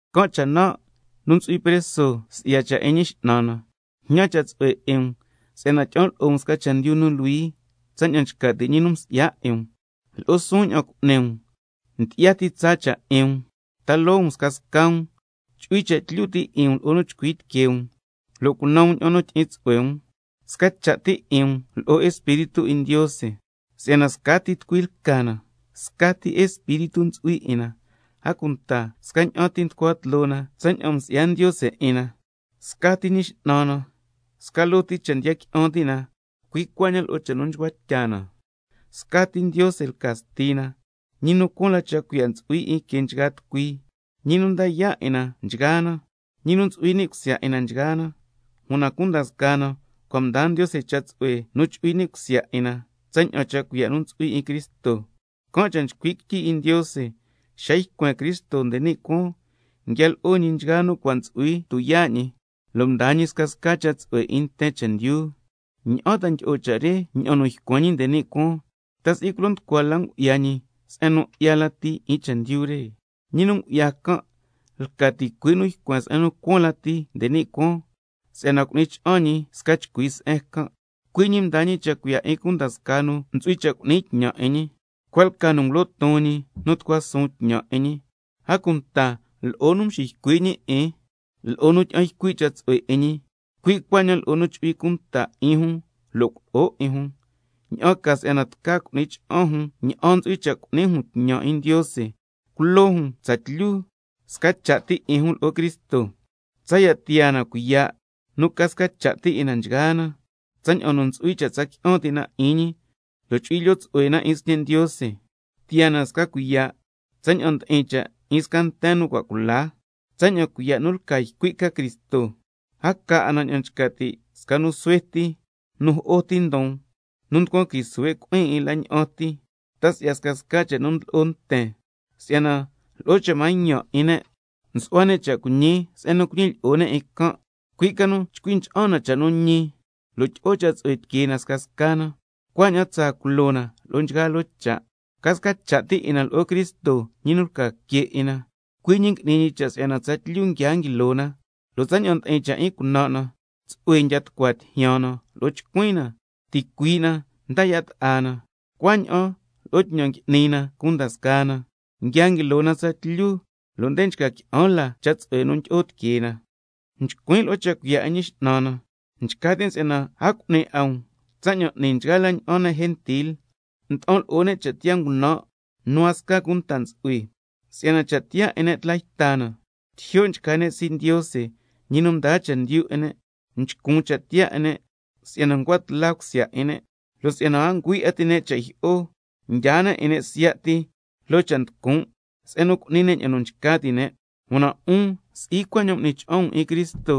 Can' cha' nan', nu ntsu'hui preso si'ya cha' 'in Ñi X'nan na, jñan cha' tsu'hue 'in um si'yana tyi'an lo'o um sca chendyu nu luhui tsaña'an nchca ti' ñi nu msi'ya 'in um. Lo'o suun ña'an cu'ni um, ndyi'ya ti tsaa cha' 'in um, ta loo um scasca um, chu'hui cha' tlyu ti' 'in um lo'o nu chcui tiquee um, lo' cunan um ña'an nu tyi'in tsu'hue um, sca cha' ti 'in um lo'o Espíritu 'in Ndiose. Si'yana scati tucui lca na, scati Espíritu ntsu'hui 'in na, a cunta scaña'an ti nducua tloo na tsaña'an msi'ya Ndiose 'in na, scati Ñi X'nan na, sca loo ti cha' ndiya qui'an ti' na, cui' cuaña'an lo'o cha' nu nchcua tya na, scati Ndiose lca Stina, ñi nu cuaan la cha' cuiya' ntsu'hui 'in que nchgaa tucui, ñi nu nda yaa' 'in na nchgaa na, ñi nu ntsu'hui ni' cusya 'in na nchgaa na. Una cunda scaa na cua' mdaa Ndiose cha' tsu'hue nu chu'hui ni' cusya 'in na tsaña'an cha' cuiya' nu ntsu'hui 'in Cristo. Can' cha' nchcui' quityi 'in Ndiose: —Xa ycuen Cristo nde ni' cuaan, nguia lo'o ñi nchgaa nu cua' ntsu'hui tuyaa' ñi, lo' mdaa ñi scasca cha' tsu'hue 'in nten chendyu—. ¿Ña'an ta ndyi'o cha' re ña'an nu ycuen ñi nde ni' cuaan? ¿Ta si'i culo nducua la ngu'ya ñi se'en nu 'ya lati 'in chendyu re? Ñi nu ngu'ya can' lca ticui' ñi nu ycuen se'en nu cuaan lati nde ni' cuaan, si'yana cu'ni cha'an ñi sca chcui se'en can'. Cui' ñi mdaa ñi cha' cuiya' 'in cunda scaa nu ntsu'hui cha' cu'ni tñan 'in ñi: Cua' lca nu ngulo ton ñi 'in nu tucua suun tñan 'in ñi, a cunta lo'o nu xiycui' ñi 'in, lo'o nu tyi'an ycui' cha' tsu'hue 'in ñi, cui' cuaña'an lo'o nu chu'hui cunta 'in jun lo' culo'o 'in jun, ña'an ca si'yana tca cu'ni cha'an jun ña'an ntsu'hui cha' cu'ni jun tñan 'in Ndiose, culo jun tsatlyu sca cha' ti 'in jun lo'o Cristo, tsaya' tiyaa na cuiya' nu ca sca cha' ti 'in na nchgaa na, tsaña'an nu ntsu'hui cha' tsa qui'an ti' na 'in ñi lo' chu'hui lyoo tsu'hue na 'in Sñe' Ndiose, tiyaa na sca cuiya' tsaña'an ndi'in cha' 'in sca nten nu cua' cula, tsaña'an cuiya' nu lca ycui' ca Cristo, a ca 'a na ña'an nchca ti' sca nu suhue ti nu jo'o ti ndon, nu nducuan qui suhue' cui'in 'in la ña'an ti, ta si'ya scasca cha' nu ndlo'o nten, si'yana lo'o cha' mañan 'in ne' nsu'hua ne' cha' cuiñi se'en nu cuñilyi'o ne' 'in can'. Cui' ca nu chcui ncha'an na cha' nu ñi, lo' tyi'o cha' tsu'hue tiquee na scasca na, cuaña'an tsa culo na lo'o nchgaa loo cha', ca sca cha' ti 'in na lo'o Cristo, ñi nu lca que 'in na. Cui' ñi ngui'ni ñi cha' si'yana tsatlyu nguia nguilo na, lo' tsaña'an ndi'in cha' 'in cunan' na, tsu'hue ndiya tucua tijyan na lo'o chcuin na, ticuii' na nda yaa' ta'a na, cuaña'an lo'o tñan ngui'ni na cunda scaa na, nguia nguilo na tsatlyu lo' nde nchca qui'an la cha' tsu'hue nu ndyi'o tiquee na. Nchcuin' lo'o cha' cuiya' 'in Ñi X'nan na, nchca tin' si'yana a cu'ni 'a um tsaña'an n'ni nchgaa la ña'an ne' gentil, nda'an lo'o ne' cha' tiyaa ngunan' nu a sca cunta ntsu'hui, si'yana cha' tiyaa 'in ne' tla yta na, tijyo' nchca ne' sii' Ndiose, ñi nu ndaa chendyu 'in ne', nchcun cha' tiyaa 'in ne' si'yana ncua tla cusya 'in ne', ñi a ngüi 'a ti' ne' cha' jyi'o, mdyaa ne' 'in ne' siya' ti loo cha' nducun' se'en nu cu'ni ne' ña'an nu nchca ti' ne'. Una 'un si'i cuaña'an m'ni cha'an um 'in Cristo,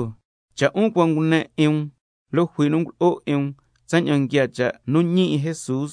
cha' 'un cua' ngune 'in um, lo' jui nu ngulo'o 'in um tsaña'an nguiaa cha' nu ñi 'in Jesús.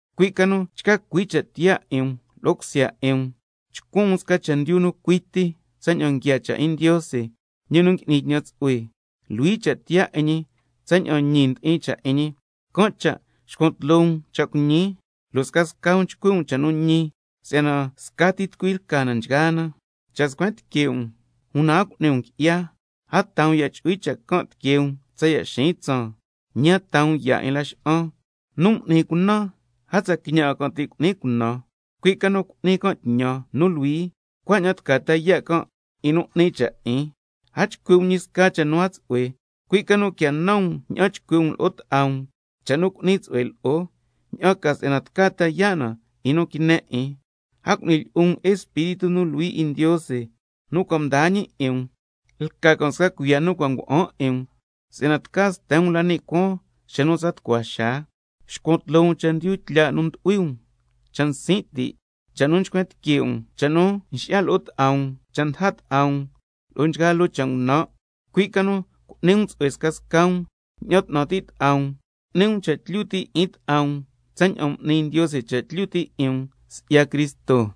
cui' ca nu chca cui cha' tiyaa 'in um lo'o cusya 'in um, chcuan um sca chendyu nu cui ti tsaña'an nguiaa cha' 'in Ndiose, ñi nu ngui'ni tñan tsu'hue, luhui cha' tiyaa 'in ñi, tsaña'an ñi ndi'in cha' 'in ñi. Can' cha' xcuan tloo um cha' cuiñi, —lo' chcui' um cha' nu ñi scasca um—, si'yana scati tucui lca na nchgaa na. —Cha' scuen tique' um una a cu'ni um qui'ya—, a taa um ya' chu'hui cha' can' tiquee um tsaya' xiin tsaan, ñi a taa um ya' 'in laxa'an. Nu m'ni cunan, a tsa quiñan 'a can' ti' cu'ni cunan, cui' ca nu cu'ni can' tñan nu luhui, cuaña'an tca ta yaa' can' 'in nu 'ni cha' 'in. A chcui' um ñi sca cha' nu a tsu'hue, cui' ca nu quia nan um ña'an chcui' um lo'o ta'a um cha' nu cu'ni tsu'hue lo'o, ña'an ca si'yana tca ta yaa' na 'in nu quine 'in. A cu'ni lyi'un um 'in Espíritu nu Luhui 'in Ndiose nu cua' mdaa ñi 'in um, lca can' sca cuiya' nu cua' ngua'an 'in um si'yana tca sten um la ni' cuaan xa nu tsa tucua xaa. Xcuan tloo um chendyu tlya' nu ndu'hui um, cha' nsin' ti', cha' nu nchcuen tique' um, cha' nu nxi'ya lo'o ta'a um, cha' ndaja ta'a um, lo'o nchgaa loo cha' ngunan'. Cui' ca nu cu'ni um tsu'hue scasca um, ña'an 'tnan ti' ta'a um, cu'ni um cha' tlyu ti' 'in ta'a um tsaña'an m'ni Ndiose cha' tlyu ti' 'in um si'ya Cristo.